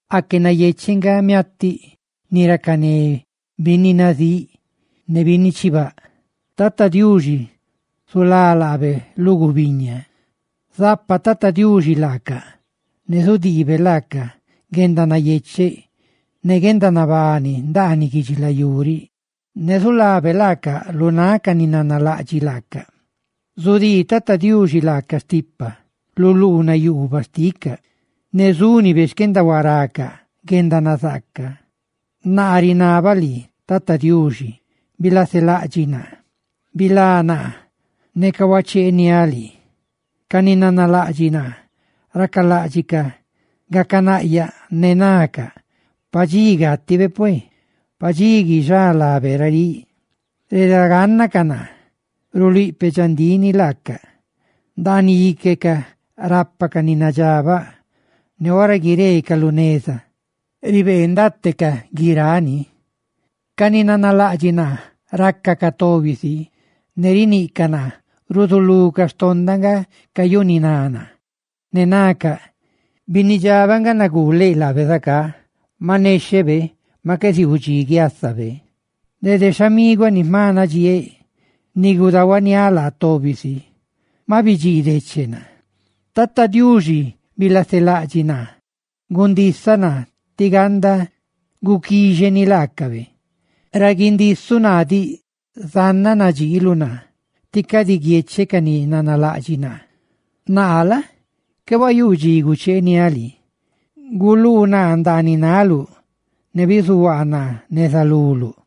Aque nayecheꞌ nga miatiꞌ ni racané binni nazíꞌ ne binni chibáꞌ; tí Tata Diuxi zulá laabe lu gubiña. Zapa Tata Diuxi laacaꞌ, ne zudiibe laacaꞌ guendanayecheꞌ ne guendanabani ndaaniꞌ guidxilayú riꞌ, ne zulabe laacaꞌ lu náꞌ ca ni nanalaꞌdxiꞌ laacaꞌ. Zudii Tata Diuxi laacaꞌ stipa, lu luunaꞌ yuubaꞌ xticaꞌ; ¡ne zúnibe xquendahuaracaꞌ guendanazaaca! Naa rinabaꞌ lii: «Tata Diuxi, bilaselaꞌdxiꞌ naa; bisianda naa, neca huacheeniáꞌ lii.» Ca ni nanalaꞌdxiꞌ naa racaláꞌdxicaꞌ gacanaꞌyaꞌ, ne nacaꞌ: «Pa dxi gátibe pue, pa dxi guixá lábe raríꞌ.» Redagánnacaꞌ naa ruluíꞌ peꞌ dxandíꞌ ni laacaꞌ; ndaaniꞌ íquecaꞌ rápacaꞌ ni nadxabaꞌ, ne ora guireecaꞌ lu neza ribeendatecaꞌ guiráꞌ ni. Ca ni nanalaꞌdxiꞌ naa racacaꞌ tobi si ne riniꞌcaꞌ naa; ruzulucaꞌ, xtondaꞌ nga cayuniná naa, Ne nacaꞌ: «Binnidxabaꞌ nga nuguu laabe zacá; maꞌ nexhebe maꞌ qué ziuu dxi guiásabe.» Dede xhamiguaꞌ ni jma nadxieeꞌ, ni gudahuaniáꞌ laa tobi si, maꞌ bidxiideche naa. Tata Diuxi, bilaselaꞌdxiꞌ naa; gundisaꞌ naa tí ganda guquíxeni laacabe. Ra gundisuꞌ naa diꞌ, zannaꞌ nadxiiluꞌ naa: tí cadi guiecheꞌ ca ni nanalaꞌdxiꞌ naa. Naa la? qué huayuu dxi gucheeniáꞌ lii, guluu naa ndaaniꞌ náluꞌ, ne bizuhuaa naa neza luluꞌ.